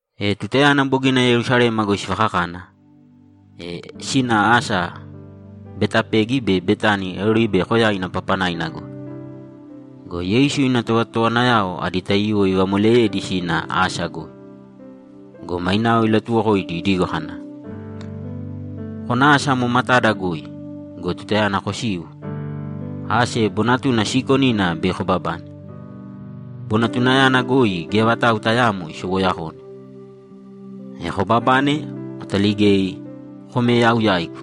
E tutayana bogina Yerusalema goi sivakakana, e sina asa Betapegi be Betani Oribe Koyaina papanaina goi. Go Yeisu ina tovatotowanayao adi taiyuwo ivamoleyedi sina asa goi. Go mainao ilatuwokoidi idigo kana, ‘Kōna asa amo matada goi go, tutayana kosiu, ase bonatuna siikonina bei kobabane. Bonatunayana goi geya vatau tayaamo isowoyakone. E kobabane, kotaligēi kōme yau yaigu.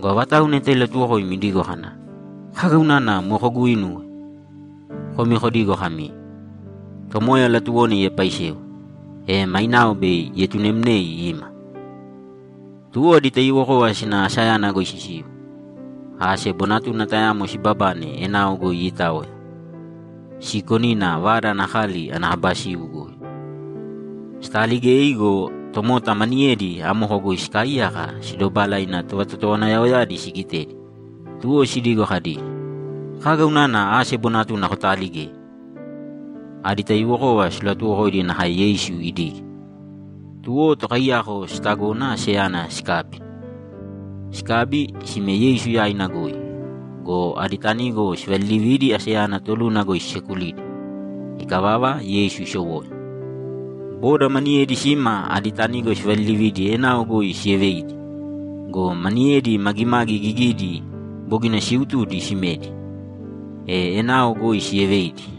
Go avatau neta ilatuwokoimi idigo kana, “Kaga unana moe koguuinuwe?” Komi kodīgo kami, “Tomoya latuwona iepaisewe, e mainao bei ietunemnei ima.”’ Tuwo adi taiyuwokova sina asayana goi sisiu, ase bonatuna tayamo sibabane enao goi iitaoya, siikonina vada ana kali ana kaba siu goi. Sitaaligei go, tomota maniyedi amoko goi sikaaiyaka sidobala ina tovatotowanayaoyadi sigitedi, tuwo sidigo kadi, ‘Kaga unana ase bonatuna kotaaligei?’ Adi taiyuwokova silatuwokoidi nakae Yeisu idige. Tuwo tokaiyako sitagona aseyana sikabi. Sikabi, sime Yeisu yaina goi go, adi tanigo sivalilividi aseyana toluna goi sisekulidi. Ikavava, Yeisu isowoya. Boda maniyedi sima adi tanigo sivalilividi enao goi sieveidi. Go maniyedi magimagi gigidi bogina siiutudi simedi, e enao goi sieveidi.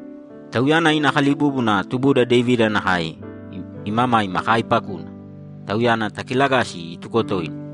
Tauyana ina kalibúbuna tubuda Devida nakae imamaima kaaipakuna. Tauyana takilagāsi ituko toina!’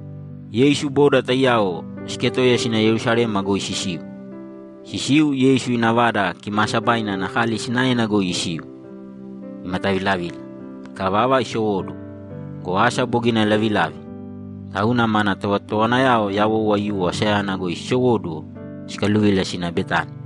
Yeisu boda taiyao siketoiya sina Yerusalema goi sisiu. Sisiu, Yeisu ina Vada Kimaasabaina ana kali sinaena goi isiu, imatavilavila. Ikavava, isowóduwo go, asa bogina lavilavi, tauna mana tovatotowanayao yawou aiyuwo asayana goi sisowóduwo sikaluvila sina Betani.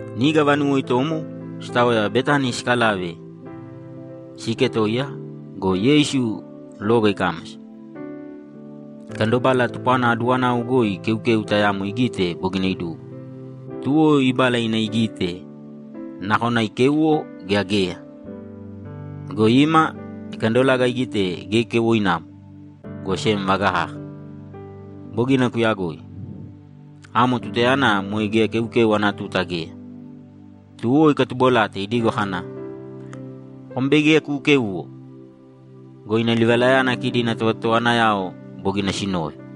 Niga vanuwo itomo, sitaoya Betani sikalave siiketoiya go, Yeisu loga ikámasa. Ikandobala tupwana aduwanau goi keukeu tayamo igite bogina idugo. Tuwo ibala ina igite nakona ikéuwo gea geya. Go ima, ikandolaga igite geya keuwoinamo, go sem vaga kaka. Bogina kuyagoi. Amo tutayana moe geya keukeu ana tuta geya. Tuwo ikatubolate idigo kana, ‘Kom bei geya kuukēuwo!’ Go ina livalayana kidi ina tovatotowanayao bogina sinove.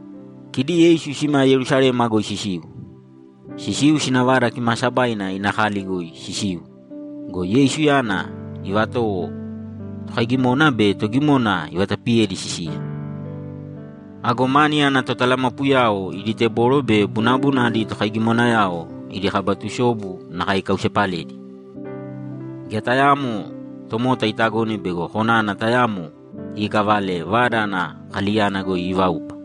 Kidi Yeisu sima Yerusalema goi sisiu. Sisiu sina Vada Kimaasabaina ina kali goi sisiu go, Yeisuyana ivatowo tokaigimona be togimona ivatapiyedi sisiya. Ago mani ana totalamapuyao idi teboro be bunabuna adi tokaigimonayao idi kaba tusobu nakae ikausepaledi. Geya tayaamo tomota itagone bego konana tayamo iikavale Vada ana kaliyana goi iivaupa.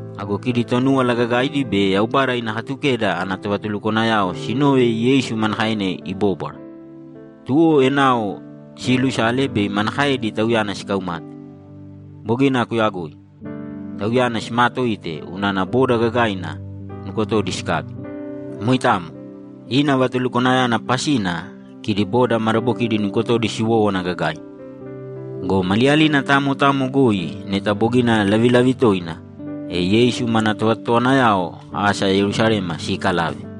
Ago kidi Tonúwala Gagaidi be Yaubada ina Katukeda ana tovatulukwanayao sinove Yeisu manakaena ibóbwara, tuwo enao siilusala bei manakaedi Tauyana sikaumate. Bogina kuyagoi. Tauyana simaatoite unana boda gagaina nukotodi sikabi. Moitamo. Ina vatulukwanayana pasina kidi boda madabokidi nukotodi siwowówana gagaina. Go maliyalina tamo tamo goi neta bogina lavilavi toina, e Yeisu mana tovatotowanayao asa Yerusalema siikalave.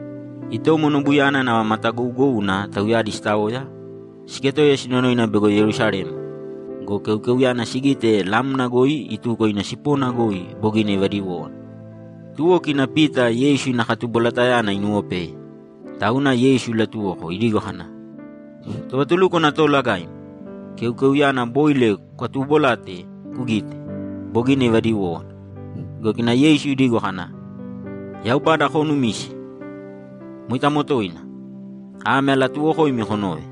Itomo nobuyana nava matagougouna tauyadi sitaoya, siketoiya sinonoina bego Yerusalema go, keukeuyana sigite lamna goi ituko ina sipona goi bogina ivadiwówana. Tuwo kina Pita Yeisu ina katubolatayana inuwopeye, tauna Yeisu ilatuwoko idigo kana, ‘Tovatulúkwana Toolagaim, keukeuyana boile kukatuubolate kugīte, bogina ivadiwówana.’ Go kina Yeisu idigo kana, ‘Yaubada koonumīse. Moitamo toina! Ame alatuuwokoimi konōve: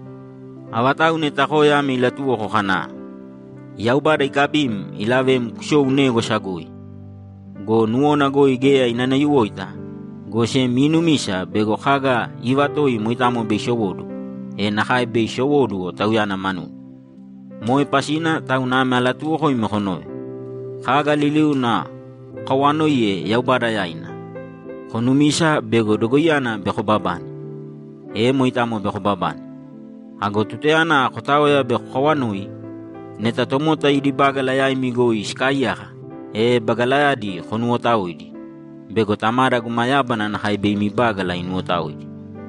Avatau neta koya ame ilatuwoko kana, “Yaubada ikabim ilavem kusōu négwasa goi” go, nuwona goi geya inanayuwoita, go sem iinumisa bego kaga iivatoi moitamo bei isowóduwo, e nakae bei isowóduwo tauyana manuna. Moe pasina tauna ame alatuuwokoimi konōve: Kaga liliuna kokawaanoiye Yaubada yaina, konumīsa bego dogoiyana bei kobabane, e moitamo bei kobabane. Ago tutayana kotaoya bei kokawanoi, neta tomota idi bágala yaimi goi sikaaiyaka, e bagalayadi konuwotaōidi bego Tamada guma yábana nakae bei imi bágala inuwotaoidi.’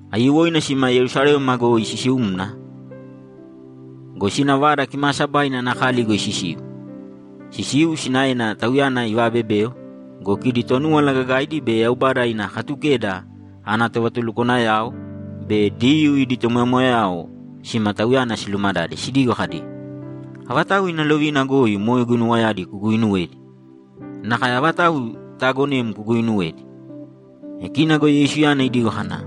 Aiyuwoina sima Yerusalema goi sisiumna go, sina Vada Kimaasabaina ana kali goi sisiu. Sisiu, sinaena Tauyana ivaabebeo go, kidi Tonúwala Gagaidi be Yaubada ina Katukeda ana tovatulukwanayao be Diyuu idi tomoyamoyayao sima Tauyana silumadade sidigo kadi, ‘Avatau ina lovina goi moe guinuwayadi kuguuinuwedi? Nakae avatau itaagonem kuguuinuwedi?’ E kina go Yeisuyana idigo kana,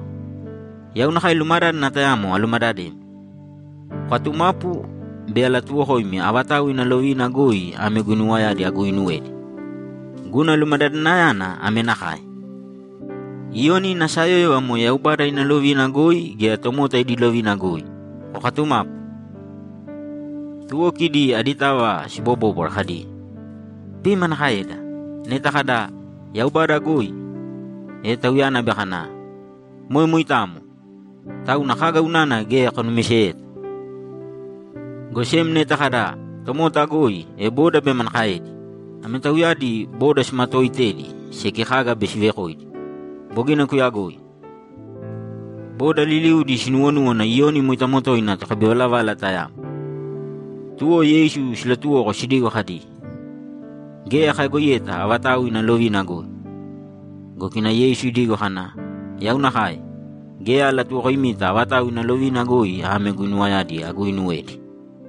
‘Yau nakae lumadádana tayamo alumadademi. Kokatumāpu, bei alatuwokoimi avatau ina lovina goi ame guinuwayadi aguuinuwedi. Guna lumadadanayana ame nakae: Iyoni ina sayóyova moe Yaubada ina lovina goi gea tomota idi lovina goi? Kokatumāpu.’ Tuwo kidi aditava sibobóbwara kadi, ‘Bei manakaeda? Neta kada, “Yaubada goi”, e Tauyana bei kana, “Moe moitamo! Tauna kaga unana geya konumiseyeta?” Go sem neta kada, “Tomota goi”, e boda bei manakaedi?’ Ame tauyadi boda simatooitedi seki kaga bei sivekoidi. Bogina kuyagoi. Boda liliudi sinuwonúwana Iyoni moitamo toina tokabivalavala tayamo. Tuwo Yeisu silatuwoko sidigo kadi, ‘Geya kayagoiyeta avatau ina lovina goi.’ Go kina Yeisu idigo kana, ‘Yau nakae, geya alatuwokoimita avatau ina lovina goi ame guinuwayadi aguuinuwedi.’